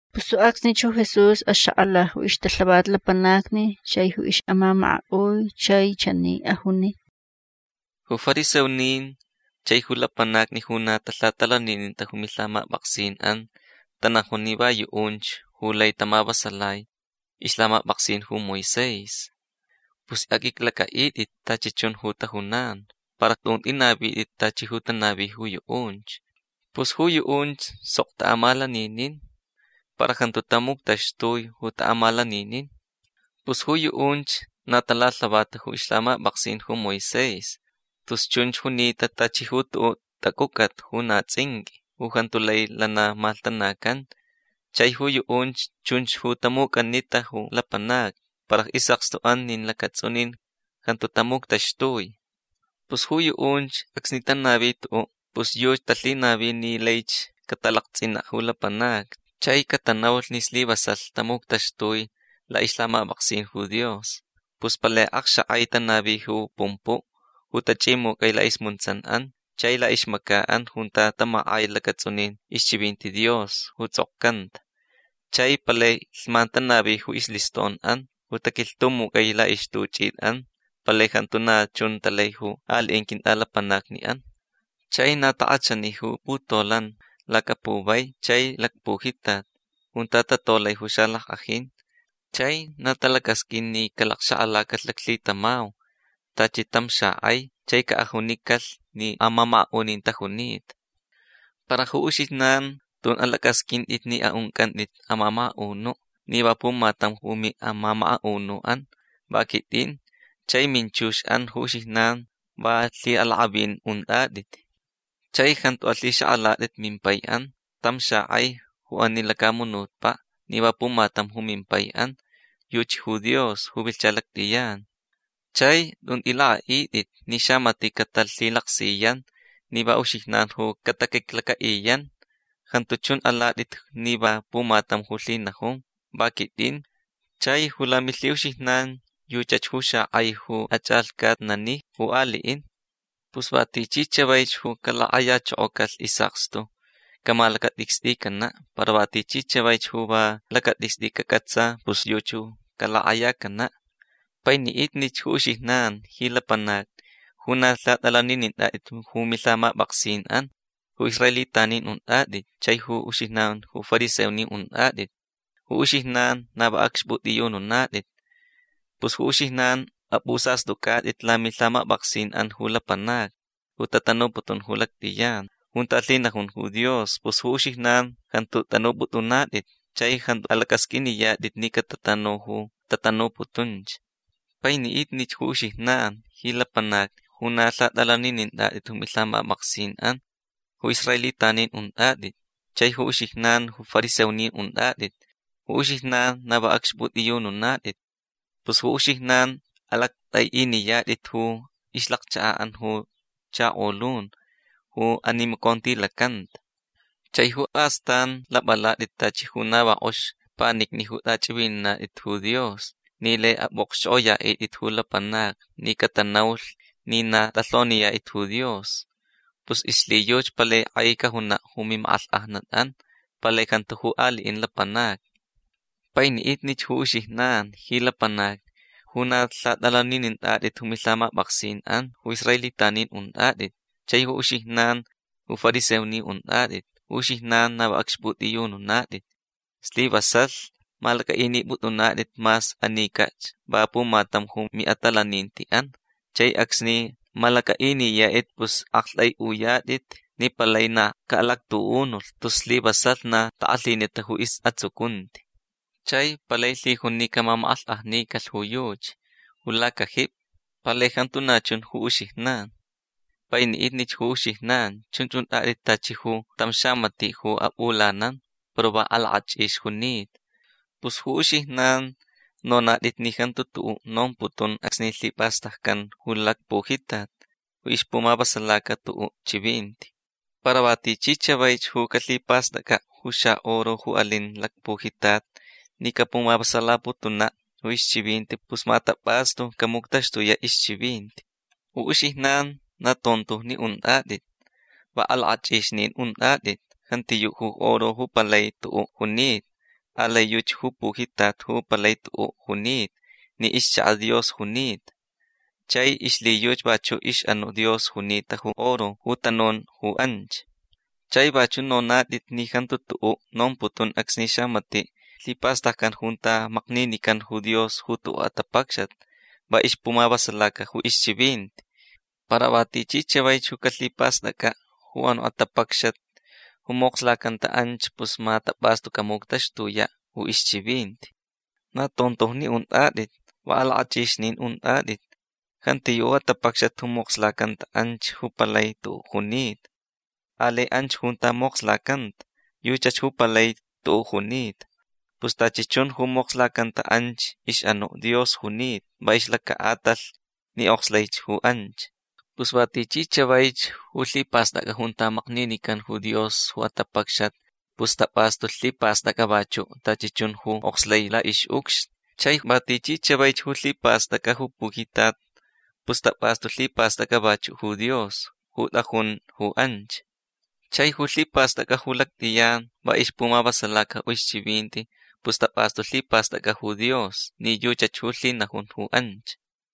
Pus ju acsnich ju Jesús axak'ala ju ixtalhavat lapanacni chai ju ix'amamaka'ui. Chai chani ajuni: ―Ju fariseonin chai ju lapanacni ju na talhatalanininta ju milhamap'aksin'an tanajun ni va yu'unch ju lai tamavasalai ixlhamap'aksin ju Moisés. Pus aq'uiclac'a'it'it tachi chun ju tajunan. Para tun t'inavit'it tachi ju tanavi ju yu'unch. Pus ju yu'unch sok ta'amalaninin para jantu tamuctaxtui ju ta'amalaninin. Pus ju yu'unch na talalhavata ju ixlhamap'aksin ju Moisés tus chunch junita tachi ju tu'u' tac'uc'at ju na ts'inq'ui. Ju jantu lai lana malhtanacan. Chai ju yu'unch chunch ju tamuc'anita ju lapanacni para is'akstu'an nin lacats'unin jantu tamuctaxtui. Pus ju yu'unch acsni tanavi tu'u' pus yuchi talhinavi ni laich catalakts'ina' ju lapanacni chai catanaulh ni slivasalh tamuctaxtui la'ixlhamap'aksin ju Dios. Pus palai akxak'ai tanavi ju pumpu' ju tach'imuc'ai la'ismuntsan'an chai la'ixmaca'an junta tamak'ai lacats'unin ixchivinti Dios ju ts'okcanta. Chai palai lhman tanavi ju isliston'an ju taquilhtumuc'ai la'ixtuch'it'an. Palai jantu na chun talai ju ali'in quint'alapanacni'an. Chai na tak'achani ju putolan lacapuvai chai lacpujitat junta tatolai ju xalack'ajin. Chai na talacasq'uin ni caxak'alacalh laclhitamau tachi tam xak'ai chai ca'ajunicalh ni amamaka'unin tajunita. Para ju uxijnan tun alac'asq'uint'it ni a'unc'ant'it amamaka'unu' ni va pumatam ju mi'amamaka'unu'an. Va quit'in. Chai minchux'an ju uxijnan va lhi'alak'avin unt'at'it. Chai jantu alhixak'alat'it mimpai'an tam xak'ai ju ani lacamunutpa' ni va pumatam mimpai'an. Yuchi ju Dios ju vilhcha lact'iyan. Chai tun t'ilak'a'it'it ni xamati' catalhilaksiyan ni va uxijnan ju cataquiclaca'iyan. Jantu chun alat'it ni va pumatam ju lhinajun. Va quit'in. Chai ju lamilhi'uxijnan yuchach ju xak'ai ju ach'alhcatnani ju ali'in. Pus va tichi chavaich ju calak'ayachokocalh is'akstu camalacat'icst'icana'. Para va tichi chavaich ju va lacat'icst'i cac'atsa pus yuchi ju calak'ayacana'. Paini'itnich ju uxijnan ji lapanacni ju na lhat'alaninint'at'it ju milhamap'aksin'an ju israelitanin unt'at'it chai ju uxijnan ju fariseonin unt'at'it. Ju uxijnan na va acxp'ut'iyununat'it. Pus ju uxijnan ap'usast'uc'at'it lamilhamap'aksin'an ju lapanacni ju tatanuputun ju lact'iyan junta lhinajun ju Dios. Pus ju uxijnan jantu t'anup'ut'unat'it chai jantu alac'asq'uiniyat'it ni catatanu ju tatanuputunch. Paini'itnich ju uxijnan ji lapanacni ju na lhat'alaninint'at'it ju milhamap'aksin'an ju israelitanin unt'at'it chai ju uxijnan ju fariseonin unt'at'it. Ju uxijnan na va acxp'ut'iyununat'it. Pus ju uxijnan alact'ai'iniyat'it ju ixlacchaka'an ju chakolun ju animacontilacanta. Chai astan lap'alat'it tachi ju na va k'ox panicni ju t'ach'ivinat'it ju Dios ni lai ap'u'okxch'ok'oya'it'it ju lapanacni ni catanaulh ni na t'alhoniyat'it ju Dios. Pus ixlhiyuchi palai k'ai cajuna' ju mimak'alhk'ajnat'an. Palai jantu ju ali'in lapanacni. Paini'itnich ju uxijnan ji lapanacni ju na lhat'alaninint'at'it ju milhamap'aksin'an ju israelitanin unt'at'it chai ju uxijnan ju fariseonin unt'at'it. Ju uxijnan na va acxp'ut'iyununat'it. Slivasalh malac'a'inip'ut'unat'it mas anic'ach va pumatam ju mi'atalaninti'an. Chai acsni malac'a'iniyat'it pus akt'ai'uyat'it ni palaich na ca'alactu'unulh tus slivasalh na tak'alhinita ju is'atsucunti. Chai palai lhijun ni camamak'alhk'ajnicalh ju yuchi ju lacajipi. Palai jantu na chun ju uxijnan. Paini'itnich ju uxijnan. Chunch unt'at'it tachi ju tam xamati' ju ap'ulanan para va alak'ach'ix junita. Pus ju uxijnan nonat'it ni jantu tu'u' nomputun acsni lhipastaccan ju lacpujitat ju ixpumavasalaca tu'u' chivinti. Para va tichi chavaich ju calhipast'ac'a' ju xa'oro ju alin lacpujitat ni capumavasalaputuna' ju ixchivinti pus ma tap'astu camuctaxtuya' ixchivinti. Ju uxijnan na tontojni unt'at'it. Va alak'ach'ixnin unt'at'it. Jantiyu' ju oro ju palai tu'u' junita. Alai yuchi ju pujitat ju palai tu'u' junita ni ixchaka' Dios junita. Chai ixlhiyuchi vachu' ix'anu' Dios junita ju oro ju tanun ju anch. Chai vachu' nonat'it ni jantu tu'u' nomputun acsni xamati' lhipast'ac'a junta makninican ju Dios ju tu'u' atapacxat va ixpumavasalaca ju ixchivinti. Para va tichi chavaich ju calhipast'ac'a' ju anu' atapacxat ju mokslacanta anch pus ma tap'astu camuctaxtuya' ju ixchivinti. Na tontojni unt'at'it. Va alak'ach'ixnin unt'at'it. Jantiyu' ju atapacxat ju mokslacanta anch ju palai tu'u' junita. Alai anch junta mokslacanta. Yuchach ju palai tu'u' junita. Pus tachi chun ju mokslacanta anch ix'anu' Dios junita va ixlaca'atalh ni okslai ju anch. Pus va tichi chavaich ju lhipast'ac'a junta makninican ju Dios ju atapacxat pus tap'astu lhipast'ac'a vachu' tachi chun ju okslai la'ix'ucxni. Chai va tichi chavaich ju lhipast'ac'a ju pujitat pus tap'astu lhipast'ac'a vachu' ju Dios ju t'ajun ju anch. Chai ju lhipast'ac'a ju lact'iyan va ixpumavasalaca ju ixchivinti pus tap'astu lhipast'ac'a ju Dios ni yuchach ju lhinajun ju anch.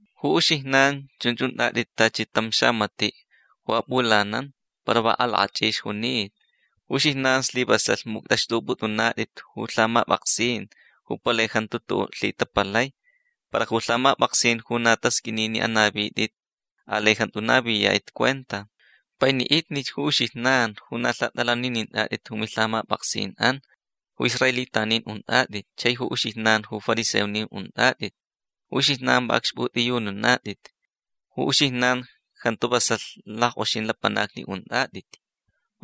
Ju uxijnan chunch unt'at'it tachi tam xamati' ju ap'ulanan para va alak'ach'ix junita. Ju uxijnan slivasalh muct'axt'up'ut'unat'it ju lhamap'aksin ju palai jantu tu'u' lhitapalai. Para ju lhamap'aksin ju na tasq'uini ni anavit'it alai jantu naviyat'it cuenta. Paini'itnich ju uxijnan ju na lhat'alaninint'at'it ju milhamap'aksin'an ju israelitanin unt'at'it chai ju uxijnan ju fariseonin unt'at'it. Ju uxijnan va acxp'ut'iyununat'it. Ju uxijnan jantu vasalh lack'oxin lapanacni unt'at'it.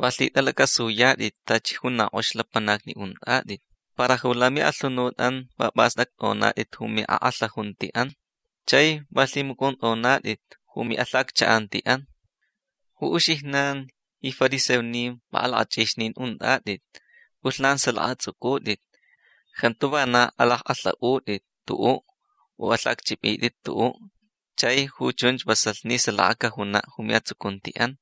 Va lhit'alac'asuyat'it tachi ju na k'ox lapanacni unt'at'it para ju lami'alhunut'an va p'ast'act'onat'it ju mi'ak'alhajunti'an. Chai va lhimuc'unt'onat'it ju mi'alhaccha'anti'an. Ju uxijnan ji fariseonin va alak'ach'ixnin unt'at'it. P'ulhnan salaka ats'uc'ut'it. Jantu vana alack'alha'ut'it tu'u' u alhacch'ip'it'it tu'u'. Chai ju chunch vasalh ni salaka cajuna' ju mi'atsucunti'an.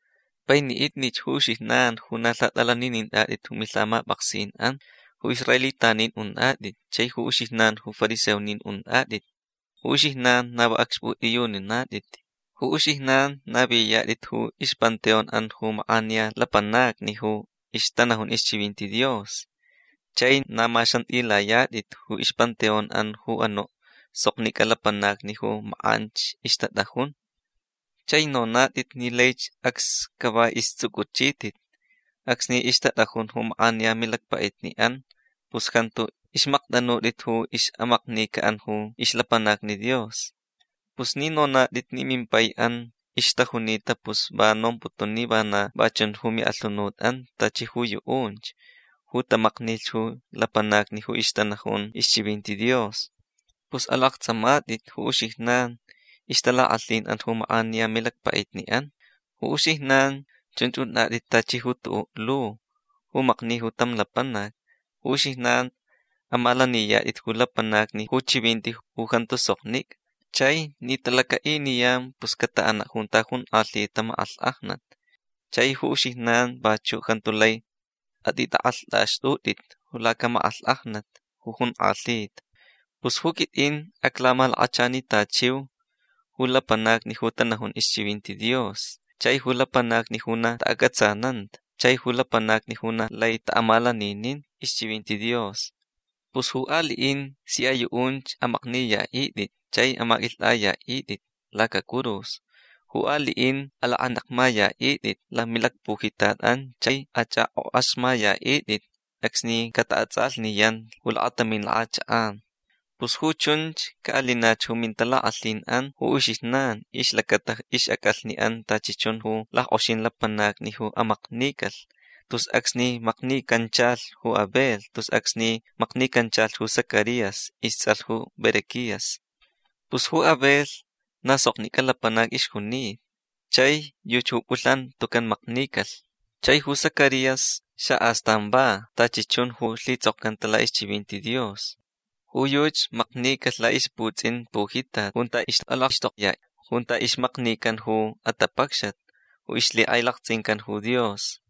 Paini'itnich ju uxijnan ju na lhat'alaninint'at'it ju milhamap'aksin'an ju israelitanin unt'at'it chai ju uxijnan ju fariseonin unt'at'it. Ju uxijnan na va acxp'ut'iyununat'it. Ju uxijnan naviyat'it ju ixpanteon'an ju mak'aniya lapanacni ju ixtanajun ixchivinti Dios. Chai na maxant'ilayat'it ju ixpanteon'an ju anu' soknic'a lapanacni ju mak'anch ixtat'ajun. Chai nonat'it ni laich acs cava ists'uc'uchit'it acsni ixtat'ajun ju mak'aniya milacpa'itni'an pus jantu ixmakt'anut'it ju ix'amaknica'an ju ixlapanacni Dios. Pus ni nonat'it ni mimpai'an ixtajunita pus va nomputun ni vana va chun ju mi'alhunut'an tachi ju yu'unch ju tamaknilh ju lapanacni ju ixtanajun ixchivinti Dios. Pus alakts'amat'it ju uxijnan ixtalak'alhin'an ju mak'aniya milacpa'itni'an. Ju uxijnan chunch unt'at'it tachi ju tu'u' lu ju makni ju tam lapanac. Ju uxijnan amalaniyat'it ju lapanacni ju chivinti ju jantu soknic'a. Chai ni talaca'iniyan pus cata'ana' junta jonk'alhita mak'alhk'ajnat. Chai ju uxijnan vachu' jantu lai at'it'ak'alht'axt'ut'it lacamak'alhk'ajnat ju jonk'alhita. Pus ju quit'in aclamalakachanitachiu ju lapanacni ju tanajun ixchivinti Dios chai ju lapanacni ju na ta'ac'atsananta chai ju lapanacni ju na lai ta'amalaninin ixchivinti Dios. Pus ju ali'in sia yu'unch amakniya'it'it chai amaq'uilht'aya'it'it lacacurus. Ju ali'in alak'anekmaya'it'it lamilacpujitat'an chai ach'ak'ok'axmaya'it'it acsni cata'ats'alhniyan ju lakatamin lak'achak'an. Pus ju chunch ca'alinach ju mintalak'alhin'an ju uxijnan ixlacata ix'ac'alhni'an tachi chun ju lack'oxin lapanacni ju amaknicalh tus acsni maknicanchalh ju Abel tus acsni maknicanchalh ju Zacarías ists'alh ju Berequías. Pus ju Abel na soknic'a lapanac ixjunita chai yuchi ju p'ulhnan tucan maknicalh. Chai ju Zacarías xa'astan va tachi chun ju lhits'okcanta la'ixchivinti Dios. Ju yuchi maknicalh la'ixputsin pujitat junta ixt'alakxtokya junta ixmaknican ju atapacxat ju ixlhik'ailakts'incan ju Dios.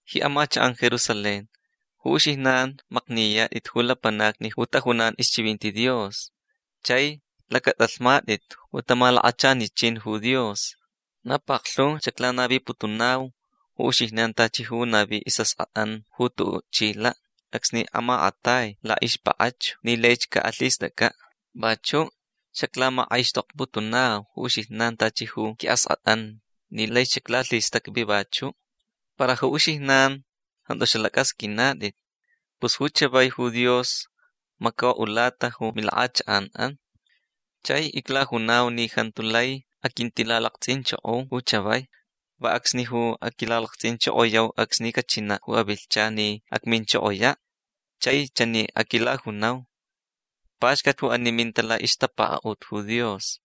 Ji amachak'an Jerusalén. Ju uxijnan makniyat'it ju lapanacni ju tajunan ixchivinti Dios chai lac'at'alhmat'it ju tamalakachanichin ju Dios. Na paklhu xaclanaviputunau ju uxijnan tachi ju navi is'ask'at'an ju tu'u' chila' acsni amak'atai la'ixpak'achu ni laich ca'alhist'ac'a'. Vachu' xaclamak'aixtokputunau ju uxijnan tachi ju qui'ask'at'an ni laich xaclalhistacvi vachu'. Para ju uxijnan jantu xalac'asq'uinat'it. Pus ju chavai ju Dios maco'ulata ju milak'achak'an. Chai iclajunau ni jantu lai aquintilalakts'inchoko ju chavai. Va acsni ju aquilalakts'inchokoyau acsni cachina' ju avilhchan ni acminchokoya' chai chani aquilajunau: “Paxcat ju ani minta la'ixtapaka'ut ju Dios”.